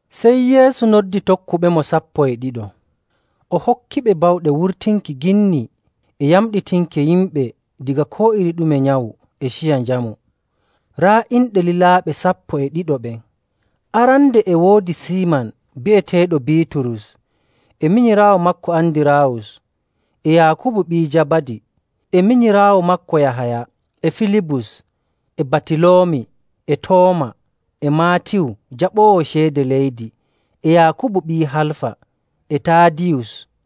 Sey Yeesu noddi tokkuɓemo sappo e ɗiɗo, o hokkiɓe bawɗe wurtinki ginni e yamɗitinki yimɓe daga koo iri ɗume nyawu e ciya njamu. Raa inɗe lilaaɓe sappo e ɗiɗo ɓen: arande e woodi Siiman bi'eteeɗo Biiturus, e minyiraawo maako Andiraawus, e Yaakubu ɓii Jabadi, e minyiraawo maako Yahaya, e Filibus, e Batiloomi, e Tooma, e Maatiyu jaɓoowo ceede leydi, e Yaakubu ɓii Halfa, e Taadiyus,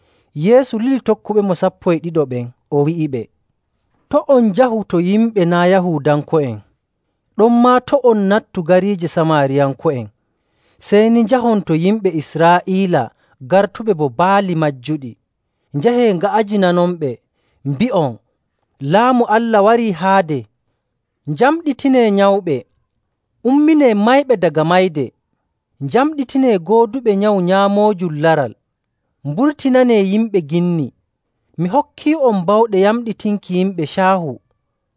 Yeesu lili tokkuɓemo sappo e ɗiɗo ɓen, o wi'iɓe, “To' on njahu to yimɓe naa' Yahuudanko'en. Ɗonmaa to' on nattu gariije Samaariyanko'en. Sey ni njahon to yimɓe Israa'iila gartuɓe bo baali majjuɗi. Njahee, nga'ajinanonɓe, mbi'on, ‘Laamu Allah warii haade.’ Njamɗitinee nyawɓe, umminee mayɓe daga mayde, njamɗitinee gooduɓe nyawu nyaamoojum laral, mburtinanee yimɓe ginni. Mi hokkii'on bawɗe yamɗitinki yimɓe caahu,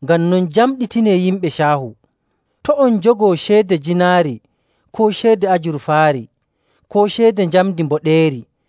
ngam non njamɗitinee yimɓe caahu. To' on njogo ceede jiinaari, koo ceede ajurfaari, koo ceede njamndi mboɗeeri.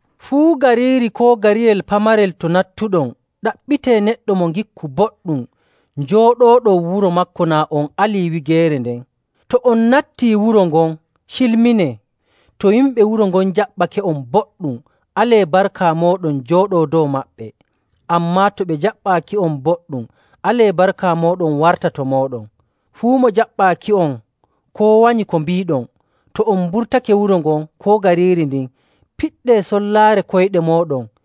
“Fuu gariiri koo gariyel pamarel to nattuɗon, ɗaɓɓitee neɗɗo mo ngikku boɗɗum, njooɗooɗon wuro maako naa on alii wigeere nden. To on nattii wuro ngon, cilminee. To yimɓe wuro ngon njaɓɓake'on boɗɗum, alee barka mooɗon jooɗoo dow maɓɓe. Ammaa to ɓe njaɓɓaaki'on boɗɗum, alee barka mooɗon warta to mooɗon. Fuu mo jaɓɓaaki'on, koo wanyi ko mbiiɗon, to on mburtake wuro ngon koo gariiri ndin, piɗɗee sollaare koyɗe mooɗon..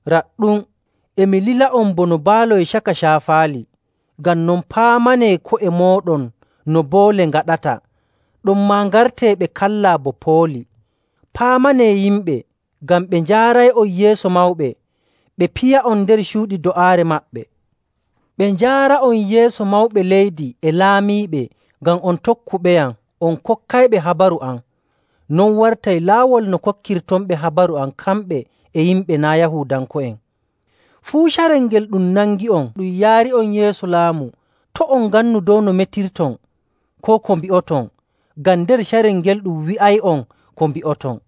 “Raɗɗum, e mi lila'on bono mbaaloy caka caafaali. Ngam non, paamanee ko'e mooɗon no boole ngaɗata, ɗonmaa ngartee ɓe kallaa bo pooli.. Paamanee yimɓe, ngam ɓe njaaray'on yeeso mawɓe, ɓe piya'on nder cuuɗi do'aare maɓɓe, ɓe njaara'on yeeso mawɓe leydi e laamiiɓe, ngam on tokkuɓeyam on kokkayɓe habaru am. Non wartay laawol no kokkirtonɓe habaru am kamɓe e yimɓe naa' Yahuudanko'en. Fuu carel ngel ɗum nangi'on ɗum yaari'on yeeso laamu, to' on ngannu dow no metirton, koo ko mbi'oton, ngam nder carel ngel ɗum wi'ay'on ko mbi'oton.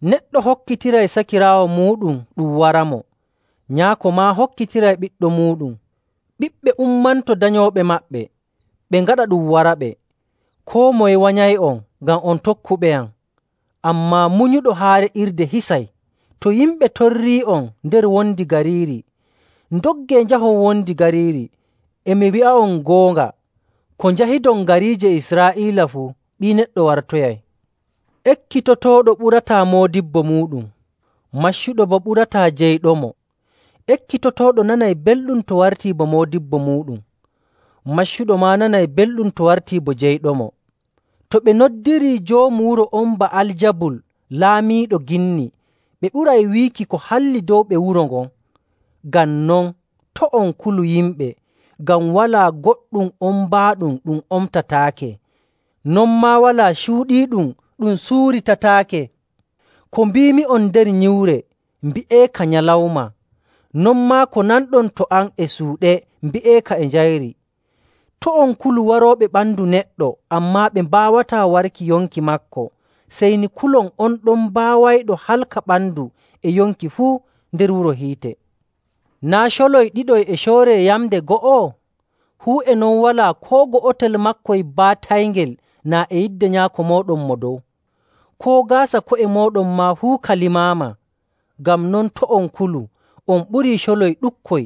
“Neɗɗo hokkitiray sakiraawo muuɗum ɗum waramo, nyaako maa hokkitiray ɓiɗɗo muuɗum. Ɓiɓɓe ummanto danyooɓe maɓɓe, ɓe ngaɗa ɗum waraɓe.. Koo moye wanyay'on ngam on tokkuɓeyam. Ammaa munyuɗo haa re'irde hisay.. To yimɓe torrii'on nder wondi gariiri, ndoggee njahon wondi gariiri. E mi wi'a'on goonga, ko njahidon gariije Israa'iila fuu, Ɓii Neɗɗo wartoyay. “Ekkitotooɗo ɓurataa moodibbo muuɗum, maccuɗo boo ɓurataa jeyɗomo.. Ekkitotooɗo nanay belɗum to wartii bo moodibbo muuɗum, maccuɗo maa nanay belɗum to wartii bo jeyɗomo. To ɓe noddirii joomu wuro on Ba'aljabul laamiiɗo ginni, ɓe ɓuray wiiki ko halli dow ɓe wuro ngon!. “Ngam non, to' on kulu yimɓe, ngam walaa goɗɗum ombaaɗum ɗum omtataake, non maa walaa cuuɗiiɗum ɗum suuritataake.. Ko mbiimi'on nder nyiwre, mbi'eeka nyalawma, non maa ko nanɗon to am e suuɗe, mbi'eeka e njayri. To' on kulu warooɓe ɓandu neɗɗo, ammaa ɓe mbaawataa warki yonki maako. Sey ni kulon on ɗon baawayɗo halka ɓandu e yonki fuu nder wuro hiite. Naa' coloy ɗiɗoy e cooree yamnde go'o? Fuu e non walaa koo go'otel maakoy baatayngel naa e yidde Nyaako mooɗon Mo Dow. Koo gaasa ko'e mooɗon maa fuu ka limaama. Ngam non, to' on kulu, on ɓurii coloy ɗuɗkoy.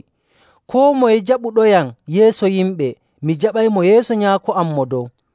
“Koo moye jaɓuɗoyam yeeso yimɓe, mi jaɓaymo yeeso Nyaako am Mo Dow.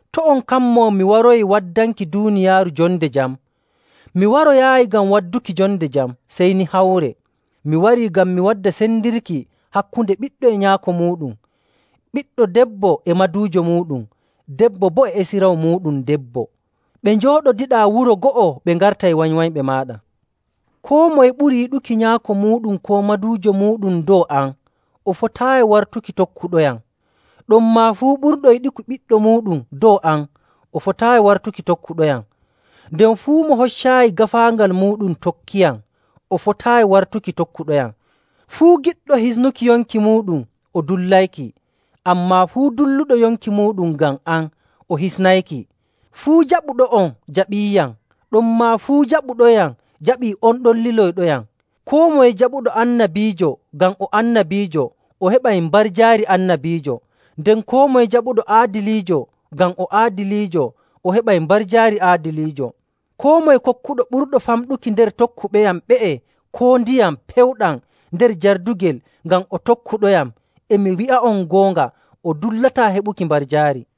“To' on kammo mi waroyii waddanki duuniyaaru jonde jam. Mi waroyaayi ngam wadduki jonde jam, sey ni hawre. Mi warii ngam mi wadda sendirki hakkunde ɓiɗɗo e nyaako muuɗum, ɓiɗɗo debbo e maduujo muuɗum, debbo boo e esiraawo muuɗum debbo. Ɓe njooɗodiɗaa wuro go'o ɓe ngartay wanywanyɓe maaɗa.. “Koo moye ɓuri yiɗuki nyaako muuɗum koo maduujo muuɗum dow am, o fotaayi wartuki tokkuɗoyam. Ɗonmaa fuu ɓurɗo yiɗuki ɓiɗɗo muuɗum dow am, o fotaayi wartuki tokkuɗoyam. Nden fuu mo hoccaayi gaafaangal muuɗum tokkiyam, o fotaayi wartuki tokkuɗoyam.. Fuu giɗɗo hisnuki yonki muuɗum, o dullayki. Ammaa fuu dulluɗo yonki muuɗum ngam am, o hisnayki.. “Fuu jaɓuɗo'on jaɓiiyam, ɗonmaa fuu jaɓuɗoyam jaɓii on ɗon liloyɗoyam.. Koo moye jaɓuɗo annabiijo ngam o annabiijo, o heɓay mbarjaari annabiijo. Nden koo moye jaɓuɗo aadiliijo ngam o aadiliijo, o heɓay mbarjaari aadiliijo. Koo moye kokkuɗo ɓurɗo famɗuki nder tokkuɓeyam ɓe'e koo ndiyam pewɗam nder jardugel ngam o tokkuɗoyam, e mi wi'a'on goonga, o dullataa heɓuki mbarjaari.”